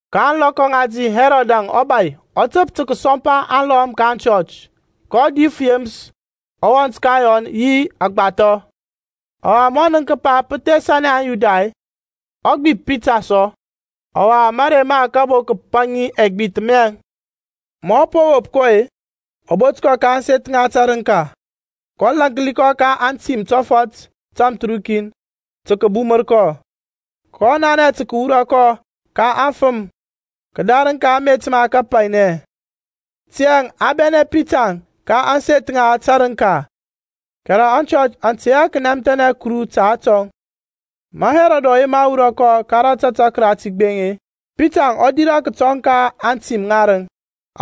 Ka ȧŋlɔkɔ ŋati Hɛrɔdȧŋ ɔbȧy ɔ təp tə kəsɔmpa alɔm ka aŋchɔch. kɔ dif Yeməs ɔwɔnt ka Yɔnȧŋ yi aŋgbathɔ. Ɔwa ma ɔ nənk kəpa pə thesanɛ aŋYuda-e, ɔ gbip Pita sɔ. Ɔwa marey ma kabo kəpaŋi ɛgbith miyaŋ. Ma ɔ po wop kɔ-e, ɔ bot kɔ ka ȧŋseth ŋa tərəŋka, kɔ lȧnki kɔ ka atim tɔfɔt tamthərukin tə kəbumər kɔ; kɔ nanɛ tə kəwura kɔ ka aŋfəm kədarəŋ ka amet ma kapainɛ. Tiyȧŋ a bɛnɛ Pita ka ȧŋseth ŋa tərənka, kɛrɛ aŋchɔch aŋ tey hɛ kənɛmthɛnɛ Kuru ta atɔŋ. Ma Hɛrɔdȧŋ ɔ yema wurɔ kɔ, ka rȧtȧtȧk rati gbeŋ-e, Pitaŋ ɔ dirȧ kətɔŋ ka atim ŋarəŋ,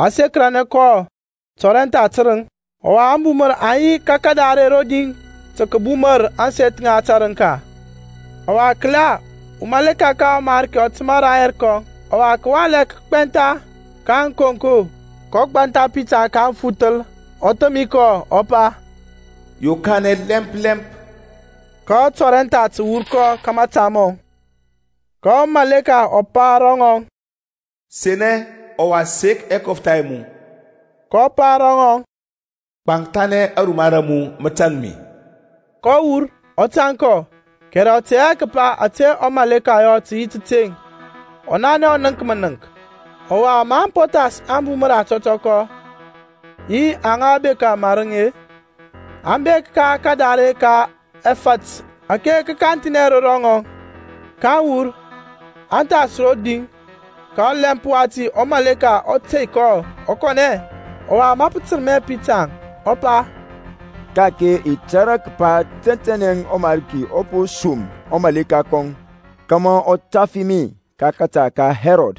a sekəranɛ kɔ tɔrɛntha tərəŋ; ɔwa ȧŋbumər aŋ yi ka kadare rodi tə kəbumər ȧŋseth ŋa tərəŋka. Ɔwa kəla wurɔ ka ɔMarki ɔ təmȧ rayɛr kɔŋ, ɔwa kəwalɛ kə gbɛntha ka ȧŋkonko; kɔ gbantha Pitaŋ ka aŋfuthəl, ɔ thəmi kɔ, ɔ pa, Yokanɛ lɛmp lɛmp. Ka atɔrɛntha tə wur ka mȧta mɔŋ. Ka ɔmaleka ɔ pa ro ŋɔŋ, Senɛ, ɔwa sek ɛkɔftha ɛ mu. Kɔ yɔ yi. Kɔ pa ro ŋɔŋ, Gbankthanɛ aruma ra mu, mə tȧŋ mi. kɔ wur, ɔ tȧŋ kɔ, kɛrɛ ɔ tɛ hɛ kəpa ȧtȧ ɔmaleka ɔ yɔ tə yi təteŋ, ɔ nanɛ ɔ nənk mənəŋk. Ɔwa maŋ po thas ȧŋbumər ȧtɔtɔkɔ, yi aŋa bekȧ marəŋ-e, aŋ bek ka kadare ka ɛfȧt ȧke kanthi ro pet; ake kə kanthinɛ ro rɔŋaŋ. Kaŋ wur, aŋ thas roŋ din, ka ɔlɛmp wati ɔmaleka ɔ tey kɔ ɔ kɔnɛ. Ɔwa ma pə tərmɛ Pitaŋ, ɔ pa, Ka-ake i tȧrȧ kəpa tɛntɛnɛ ɔMarki ɔ po som ɔmaleka kɔŋ kȧmȧ ɔ tafi mi ka kȧta ka Hɛrɔd,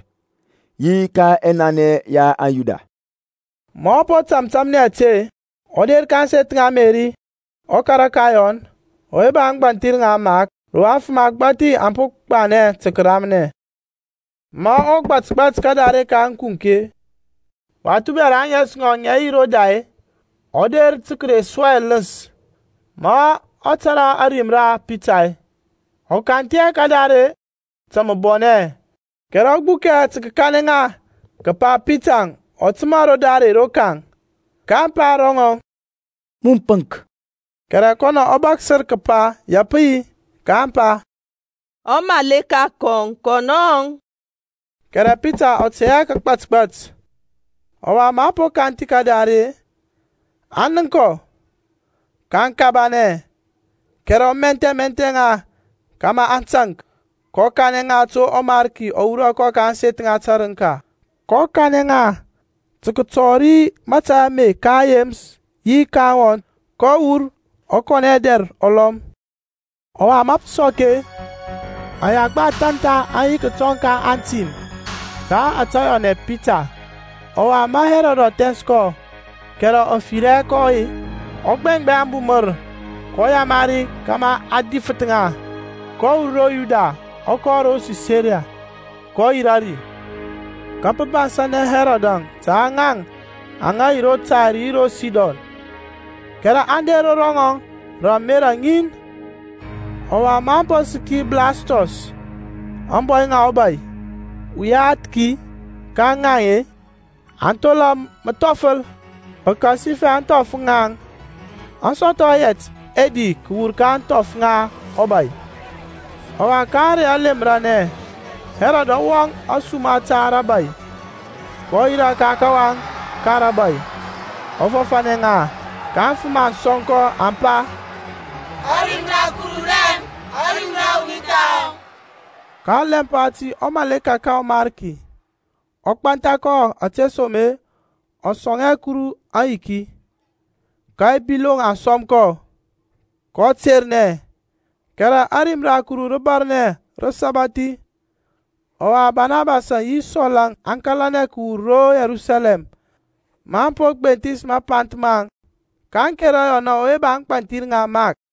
yi ka ɛnanɛ ya aŋYuda. Ma ɔ po tȧmtȧmnɛ ȧte-e, ɔ der ka ȧŋseth ŋa Meri, ɔkara ka Yɔnȧŋ, ɔwe ba ȧŋgbȧnthir ŋa Mark, ro afəm agbȧthi aŋ po gbanɛ tə kəramnɛ. Ma ɔ gbȧtgbȧt ka kadare ka ȧŋkunk-e, wath ubɛra ȧŋes ŋɔŋ ŋə yi Roda-e, ɔ der tə kəre su ɛləns. Ma ɔ tȧrȧ ȧrim ra Pitar-e, ɔ kanthi hɛ kadare ta mȧbɔnɛ, kɛrɛ ɔ gbukɛ tə kəkanɛ ŋa kəpa Pitaŋ ɔ təmȧ ro dare rokaŋ. kaŋ pa ro ŋɔŋ, Mun pəŋk. Kɛrɛ kɔnɔ ɔ bȧksər kəpa ya pə yi. Kaŋ pa, Ɔmaleka kɔŋ, kɔnɔŋ. Kɛrɛ Pitaŋ ɔ tey hɛ kəgbȧtgbȧt; ɔwa maŋ po kanthi kadare-e, aŋ nənk kɔ, kaŋ kabanɛ. Kɛrɛ ɔ mɛthmɛth ŋa kȧmȧ aŋ taŋk, kɔ kanɛ ŋa to ɔMarki ɔ wurɔ kɔ ka ȧŋseth ŋa tərəŋka. Kɔ kanɛ ŋa tə kətɔri mȧtȧy ame ka Yeməs yi ka aŋwɔnt. Kɔ wur, ɔ kɔnɛ dɛr ɔlɔm. Ɔwa ma pə sɔk-e, ayagba athȧn tha aŋ yi kətɔŋ ka antim ta ȧtȧ yɔnɛ Pita. Ɔwa ma Hɛrɔd ɔ thɛns kɔ, kɛrɛ ɔ fir hɛ kɔ-e, ɔ gbɛŋgbɛŋ ȧŋbumər, kɔ yamari kȧmȧ a difəth ŋa. Kɔ wur ro Yuda ɔ kɔ ro Sisaria, kɔ yirȧ ri. Ka pə bansȧnɛ Hɛrɔdȧŋ ta ŋaŋ aŋa yi ro Tair yi ro Sidon, kɛrɛ aŋ der ro ŋɔŋ rə ȧmerȧ ŋin; ɔwa ma aŋ po səki Blastɔs, ȧŋbɔy ŋa ɔbȧy, uyathki ka ŋaŋ-e, aŋ thola məthɔfəl, pəkasifɛ ȧŋthɔf ŋaŋ aŋ sɔthɔ yɛt ɛdi kəwur ka ȧŋthɔf ŋa ɔbȧy. Ɔwa ka ȧrey alemranɛ, Hɛrɔd ɔ wɔŋ ȧsuma ta rȧbȧy, kɔ yirȧ ka kawaŋ ka rȧbȧy, ɔ fɔfȧnɛ ŋa. Ka aŋfəm aŋ sɔŋkɔ, aŋ pa, Ȧrim ra Kuru raŋ, ȧrim ra wuni thahɔ. Ka ɔlɛmp wati wurɔ ka ɔMarki ɔ gbantha kɔ ȧtesoma-e ɔ sɔŋ hɛ Kuru aŋyiki. Ka ɛbiloŋ aŋ sɔm kɔ, kɔ ternɛ. Kɛrɛ ȧrim ra Kuru rə bȧrnɛ, rə sabathi. Ɔwa Banabasȧŋ yi Sɔl-əŋ aŋ kȧlanɛ kəwur ro Yerusalɛm maŋ po gbenthis mapanth maŋ, kaŋ kera Yɔnȧŋ ɔwe ba ȧŋgbȧnthir ŋa Mark.